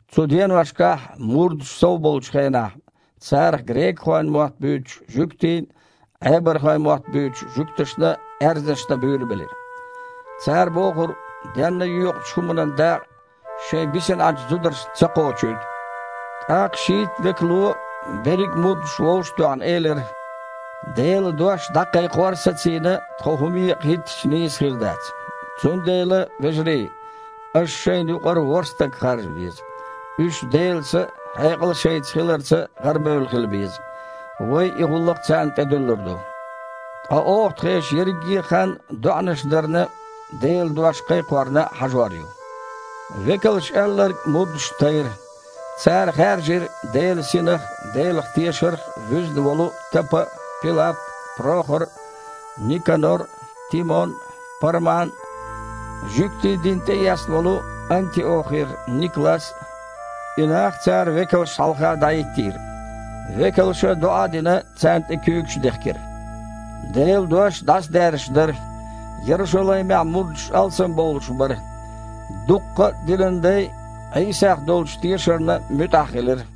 Цу деношкахь, мурдаш сов болучу хенахь, царах грекахойн мотт буьйцу жуьгтий Іебархойн мотт буьйцучу жуьгташна аьрзнаш дан буьйлабелира. Цара бохура денна йоькъучу хІуманан дакъа шайн бисина Іачу зударшна ца кхочуьйту. ТІаккха шийтта векало, берриг а мурдаш вовшах а тоьхна, элира: «Делан дош дІакхайкхор а сацийна, тхо хІума екъа хІиттича, нийса хир дац. Цундела, вежарий, аша шайна юкъара ворхІ стаг харжа веза. Уьш Делан Са а, хьекъал а шайца хиларца гІарабевлла хила беза. Вай и гІуллакх царна тІедуьллур ду. Ткъа оха тхешан ерриге а хан доІанаш дарна а, Делан дош кхайкхорна а хьажор ю». Векалша аьлларг мурдашна тайра. Цара хаьржира Делан Синах а, Делах тешарх а вуьзна волу Тапа а, Пилап а, Прохор а, Никанор а, Тимон а, Парман а, жуьгтийн дин тІеэцна волу Антиохера Никлас а. И нах цара векалшна хьалха дІахІиттийра. Векалша, доІа а дина, царна тІе куьйгаш дехкира. Делан дош дІасадаьржаш дара, Ярушалаймехь мурдаш алсамбовлуш бара. Дуккха а динан дай Іийсах долчу тешарна муьтІахь хилира.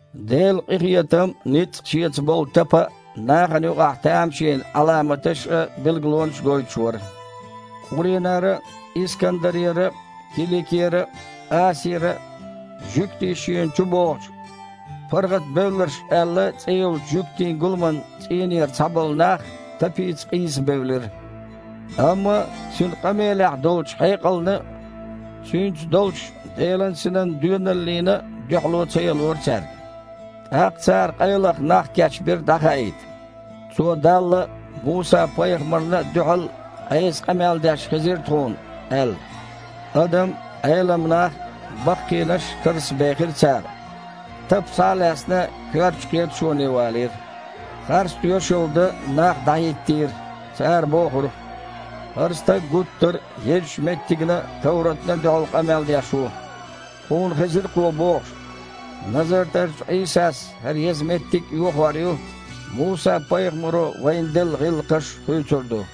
Делан къинхетам а, ницкъ а шеца болу Тапа нахана юкъахь тамашийна Іаламаташ а, билгалонаш а гойтуш вара. Къуринара а, Искандарера а, Киликера а, Асиара а жуьгтий шена чубогІучу, «паргІатбевлларш» аьлла цІе йолчу жуьгтийн гуламан цІийнера цхьаболу нах Тапица къийса бевлира. Амма цуьнан къамелехь долчу хьекъална а, цуьнца долчу Делан Синан доьналлина а дуьхьало ца ялора цаьрга. ТІаккха цара къайлаха нах кечбира дІахаийта: «Цо Далла а, Муса-пайхамарна а дуьхьал Іеса къамел деш хезира тхуна», – аьлла. Адам а, Іелам нах а, баккхийнаш а карзахбехира цара. Тапа, схьа а лаьцна, коьртачу кхеташоне валийра. Харц тоьшалла дан нах дІахІиттийра. Цара бохура: «ХІара стаг гуттар а езачу меттигна а, товратна а дуьхьал къамел деш ву. Тхуна хезира кхо бохуш: „Назартарчу Іийсас хІара еза меттиг а йохор ю, Муса-пайхамаро вайна делла гІиллакхаш а хуьйцур ду“».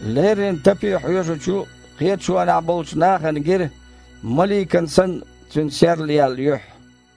Леррина Тапе хьоьжучу кхеташонехь болчу нахана гира, маликан санна, цуьнан серлаяьлла юьхь.